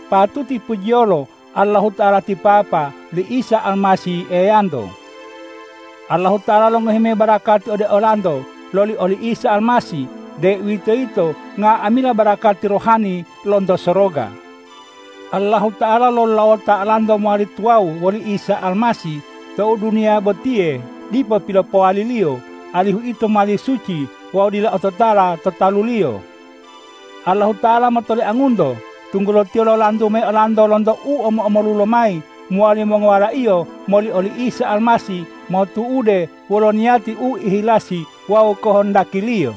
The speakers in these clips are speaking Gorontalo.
Patuti pujiyolo Allahuta'ala ti Papa li Isa Almasih Eyanto! Allahuta'ala longohi mayi barakati ode olanto loli oli Isa Almasih, deuwitoyito nga'amila barakati rohani lonto soroga. Allahuta'ala lolulawota olanto mowali tuwawu woli Isa Almasih tou duniya botiye dipo pilopowali-Liyo, alihu ito mowali suci wawu dila ototala to talu-Liyo. Allahuta'ala motoliangunto, tunggulo Tiyo lolantu mayi olanto lonto u mulo-mulolo lomayi mowali mongowala-Iyo moli oli Isa Almasih motu'ude wolo niyati u ihilasi wawu kohondaki-Liyo.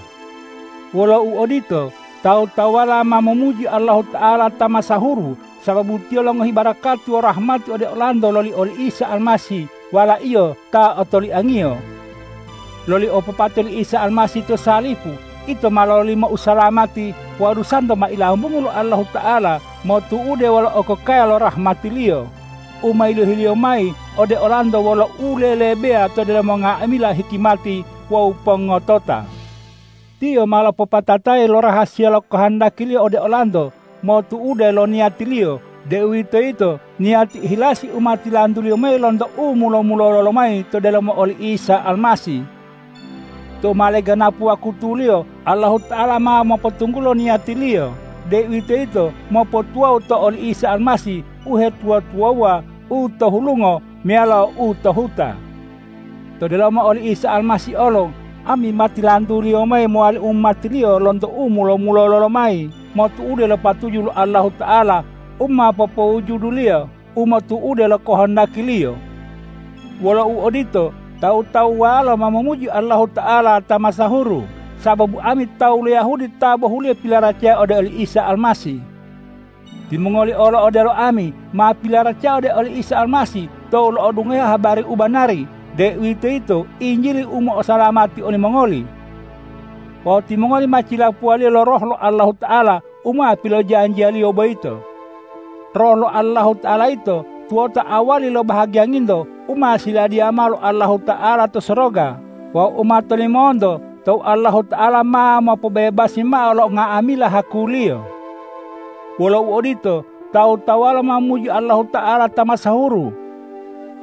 Wolo uodito, tawu-tawuwalo ma momuji Allahuta'ala ta masahuru, sababu Tiyo longohi barakati wawu rahmati ode olanto loli oli Isa Almasih Wala-Iyo ta otoliang-Iyo. Loli opopate li Isa Almasih to salipu, ito ma lololimo usalamati wawu dusanto ma ilambungu lo Allahuta'ala motu'ude lo okokaya lo rahmati-Liyo u ma yilohi-Liyo mayi ode olanto wolo u lelebeya to delomo nga'amila hikimati wawu pongotota. Tiyo ma lopopatatayi lo rahasiya lo kohondaki-Liyo ode olanto, motu'ude lo niyati-Liyo, deuwitoyito niyati ihilasi u ma tilantu-Liyo mayi lonto u mulo-mulolo lomayi to delomo oli Isa Almasih. Tou ma leganapu wakutuliyo Allahuta'ala ma mopotunggulo niyati-Liyo deuwitoyito mopotuwawu to oli Isa Almasih uhetuwa-tuwawuwa u to hulungo meyalo u to huta. To delomo oli Almasih olo ami ma tilantu-Liyo mayi mowali umati-Liyo lonto u mulo-mulolo lomayi motu'ude lo patuju lo Allahuta'ala u ma popowujuduwo-Liyo motu'ude lo kohondaki-Liyo. Wolo uodito, tawu-tawuwalo ma momuji Allahuta'ala ta masahuru sababu ami tawu lo Yahudi ta bohuliyo pilaracaya ode oli Isa Almasih. Timongoli olo odelo ami, ma pilaracaya ode oli Isa Almasih tou lo'odungohe habari u banari, deuwitoyito Injili u mo'osalamati olimongoli. Wawu timongoli ma cilapuwa-Liyo lo Roh lo Allahuta'ala u ma pilonjanjiya-Liyo boyito. Roh lo Allahuta'ala yito tuwota awali lo bahagiyanginto u ma siladiya mao lo Allahuta'ala to soroga wawu u ma tolimonto tou Allahuta'ala ma mopobebasi mao lo nga'amila haku-Liyo. Wolo uodito, tawu-tawuwalo ma momuji Allahuta'ala ta masahuru.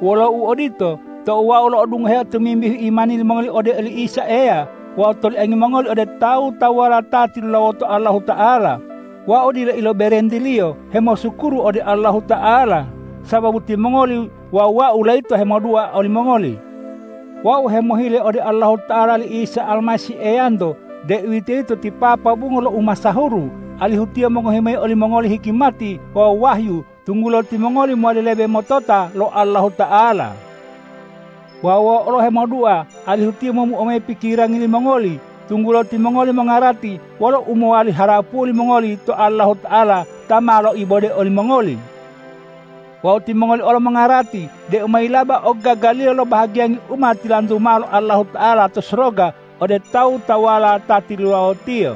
Wolo uodito, tou wau lo'odungoheo tomimbihu imani limongoli ode oli Isa Eya wawu toliangi mongoli ode tawu-tawuwala ta tilulawoto Allahuta'ala, wau dila iloberentiliyo hemosukuru ode Allahuta'ala sababu timongoli wawu wau layito hemodua olimongoli. Wau hemohile ode Allahuta'ala li Isa Almasih Eyanto, deuwitoyito ti Papa bungo lo umasahuru, alihu Tiyo mongohi mayi olimongoli hikimati wawu wahyu, tunggulo timongoli mowali lebe motota lo Allahuta'ala. Wawu wau olo hemodua alihu Tiyo momuo mayi pikirangi limongoli, tunggulo timongoli mongarati wolo u mowali harapuwo limongoli to Allahuta'ala ta ma loibode olimongoli. Wawu timongoli olo mongarati deu mayilaba ogagaliyo lo bahagiyangi u ma tilantu mao lo Allahuta'ala to soroga ode tawu-tawuwala ta tilulawo-Tiyo.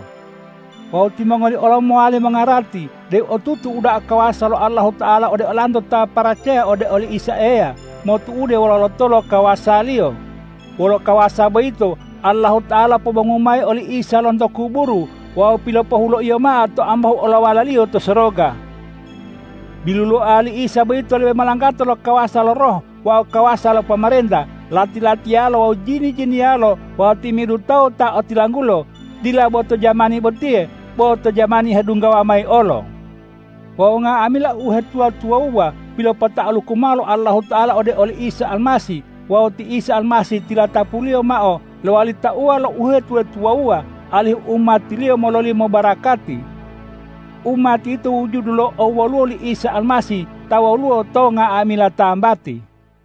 Wawu timongoli olo mowali mongarati deu otutu uda'a kawasa lo Allahuta'ala ode olanto ta paracaya ode oli Isa Eya, motu'ude wolo lotolo kawasa-Liyo. Wolo kawasa boyito Allahuta'ala lopobongu mayi oli Isa Almasih lonto kuburu wawu pilopohulo-Iyo mao to ambahu olowala-Liyo to soroga. Biluloa li Isa boyito lebe molanggatao lo kawasa lo roh wawu kawasa lo pomarenta, lati-latiyalo wawu jini-jiniyalo wawu timi'idu tawu ta otilanggulo, dila bo to jamani botiye, bo to jamani hedunggawa mayi olo. Wawu nga'amila uhetuwa-tuwawuwa pilopota'aluku mao lo Allahuta'ala ode oli Isa Almasih wawu ti Isa Almasih tilatapu-Liyo mao lowali tauwa lo uhetuwa-tuwawuwa, alihu umati-Liyo mololimo barakati. Umati yito wujudu lo owoluwo li Isa Almasih ta woluwo to nga'amila tambati.